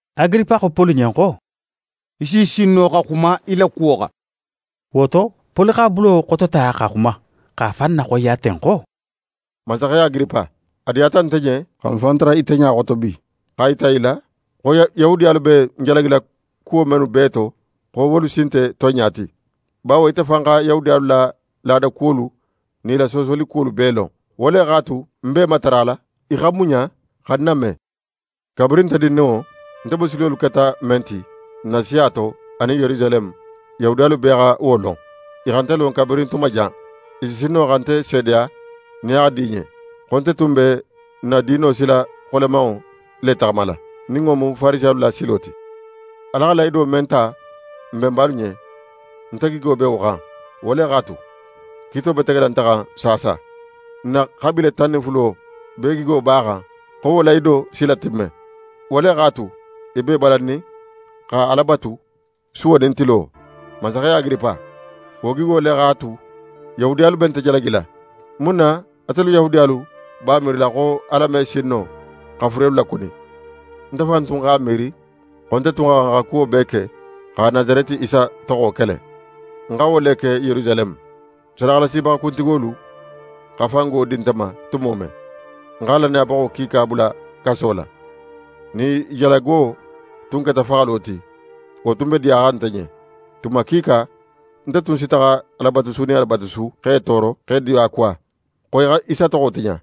Agiripa xo Poli ɲen xo: «Í si sin no xa xuma í la kuwo xan.» Wo to, Poli x'a bulo xotota xa xuma, x'a fan naxoyiya ten xo: «Mansaxe Agiripa, a diyata nte ɲen xa ń fan tara ite ɲa xoto bi, x'a yita í la xo Yahudiyalu be ń jalagila kuwo mennu bee to, xo wolu si nte tonɲa ti. Bawo ite fan xa Yahudiyalu la laada kuwolu nin i la soosoli kuwolu bee lon. Wo le x'a tu, ń b'é matarala í xa muɲa xa ń name. «Kabirin nte dindinŋo, nte bosilolu keta men ti, ń na siya to anin Yerusaleme, Yahudiyalu bee xa wo lon. I xa nte lon kabirin tuma jan. I si sin no xa nte seedeya nin a xa di i ɲen, xo nte tun be n na diino sila xolemanŋo le taxamala, nin wo mu Farisiyalu la silo ti. Ala xa lahido men ta n benbalu ɲen, nte gigo be wo xan, wo le x'a tu, kiito be tegela nte xan saasa. N na xabiile tan nin fulo bee gigo b'a xan xo wo lahido si latimme. Wo le x'a tu, i b'e balannin xa Ala batu, suwo nin tilo. Mansaxe Agiripa, wo gigo le x'a tu Yahudiyalu be nte jalagila. Mun na atelu Yahudiyalu b'a miirila xo Ala me sin no, xa furelu lakuni? Nte fan tun x'a miiri xo nte tun xa xan xa kuwo bee ke xa Nasareti Isa toxo kele. Ń xa wo le ke Yerusaleme. Sadaxalasibaxa kuntigolu xa fango di nte ma tumo men, ń xa lannayabaxo kiika bula kaso la. Nin i jalago tun keta faxalo ti, wo tun be diyaxan nte ɲen. Tuma kiika, nte tun si taxa Alabatusu nin Alabatusu, x'e tooro, x'e diyakuwa, xo i xa Isa toxo tiɲa.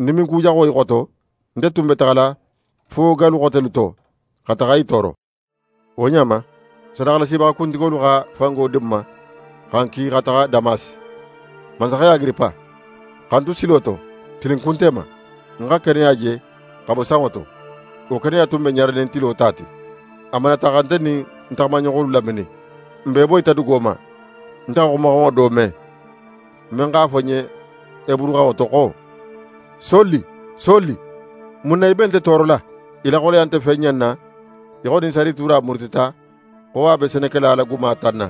Ń diminkujaxo i xoto, nte tun be taxala fo gallu xotelu to, xa taxa i tooro.» «Wo ɲa ma, sadaxalasibaxa kuntigolu xa fango di ń ma, xa ń ki xa taxa Damasi. Mansaxe Agiripa, xa ń tu silo to, tilinkunte ma, ń xa keneya je xa bo sanŋo to. Wo keneya tun be ɲaranin tilo ta ti. A manata xa nte nin ń taxamaɲoxolu laminin. N bee boyita dugo ma. Nte xa xumaxanŋo do me, men x'a fo ń ɲen heburuxanŋo to xo: “Soli, Soli, mun na í be nte toorola? Í la xoleya nte fen ɲanna, í xo nin sarituura murutita xo a be senekela la guma tanna,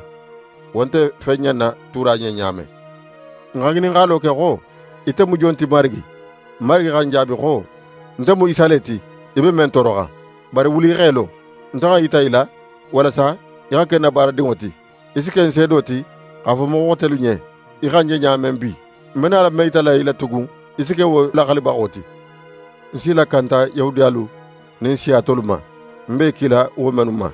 wo nte fen ɲanna tuura ɲen ɲa men.” Ń xa ŋininxalo ke xo: “Ite mu jon ti, Marigi?” Marigi xa ń jaabi xo: “Nte mu Isa le ti, í be men tooroxan. Bari wuli í x'é lo. Nte xa ń yita í la, walasa í xa ke ń na baaradinŋo ti. Í si ke ń seedo ti, x'a fo moxo xotelu ɲen í xa ń je ɲa men bi. Ń be nala men yitala í la tugun, í si ke wo laxalibaxo ti. Ń s'í lakanta Yahudiyalu nin siya tolu ma, ń be í kila wo mennu ma.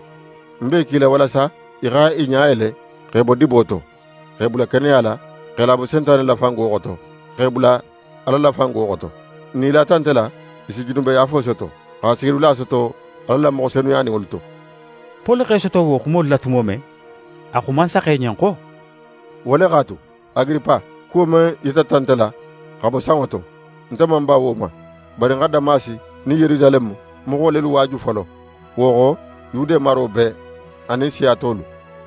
Ń be í kila walasa í xa i ɲa yele, x'e bo dibo to, x'e bula keneya la, x'e labo Sentane la fango xoto, x'e bula Ala la fango xoto. Nin i lata nte la, i si junubeyaafo soto, xa sigidula soto Ala la moxo senuyaninŋolu to.”» Poli x'é soto wo xumolu la tumo men, a xo mansaxe ɲen xo: «Wo le x'a tu, Agiripa, kuwo men yitata nte la xa bo sanŋo to, nte man ń ban wo ma. Bari ń xa Damasi nin Yerusaleme moxo lelu waaju folo; wo xo, Yude maro bee, anin siya tolu.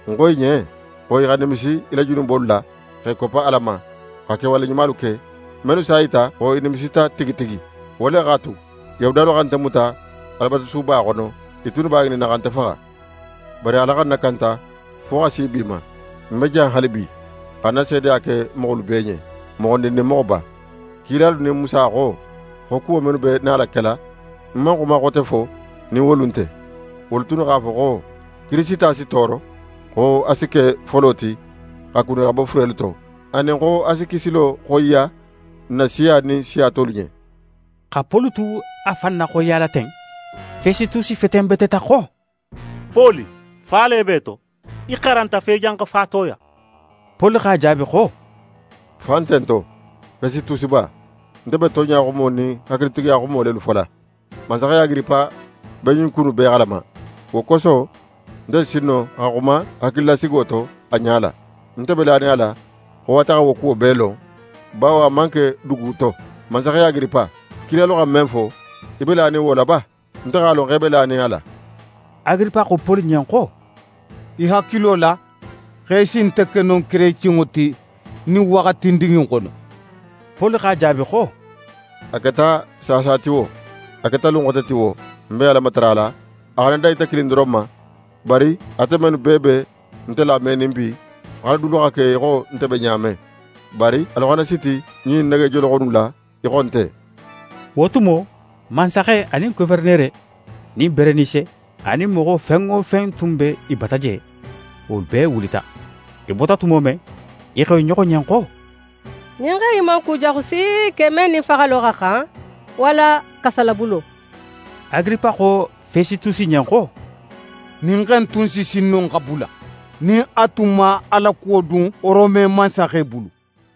Ń xo i ɲen xo i xa nimisi i la junubolu la x'e koppa Ala ma, xa kewale ɲumalu ke, mennu s'a yita xo i nimisita tigi tigi. Wo le x'a tu, Yahudiyalu xa nte muta Alabatusuba xono, i tunnu b'a ŋininna xa nte faxa. Bari Ala xa ń nakanta fo xa si bi ma. Ń be jan haalibi, xa ń na seedeya ke moxolu bee ɲen, moxondin nin moxoba. Kilalu nin Musa xo, xo kuwo mennu be nala kela, ń man xuma xote fo nin wolu nte. Wolu tunnu x'a fo xo Kirisita si tooro, xo a si ke folo ti xa kuni xa bo furelu to, anin xo a si kisilo xoyiya ń na siya nin siya tolu ɲen.» Xa Poli tu a fan naxoyiyala ten, Fesitusi fetenbeteta xo: «Poli, fa le be í to! Í xaranta fo í janxa fatoya!» Poli x'a jaabi xo: «Fa nte ń to, Fesitusiba. Nte be tonɲa xumo nin hakilitigiya xumo lelu fola. Mansaxe Agiripa be ɲin ku innu bee xalama; wo koso nte si sin no xa xuma hakililasigo to a ɲala. Nte be lanin a la xo ate xa wo kuwo bee lon, bawo a man ke dugu to. Mansaxe Agiripa, kilalu xa men fo, í be lanin wo la ba? Nte x'a lon xo í be lanin a la.» Agiripa xo Poli ɲen xo: «Í hakilo la x'é si nte ke no kerecenŋo ti ɲin waxatindin in xono?» Poli x'a jaabi xo: «A keta saasa ti wo, a keta lun xote ti wo, ń be Ala matarala a xana dan ite kilin doron ma, bari ate mennu bee be nte lamenin bi, x'alu dulu xa ke í xo nte be ɲa men, bari alu xana siti ɲin negejoloxo innu la, í xo nte.» Wo tumo, mansaxe anin goferenere, nin Berenise, anin moxo fen wo fen tun be i bata je, wolu bee wulita. I bota tumo men, i xo i ɲoxo ɲen xo: «Ɲin xe in man kujaxu si ke men nin faxalo xa xan, walla kasolabulo.» Agiripa xo Fesitusi ɲen xo: «Ɲin xe in tun si sin no xa bula nin a tun man a la kuwo dun Rome mansaxe bulu.»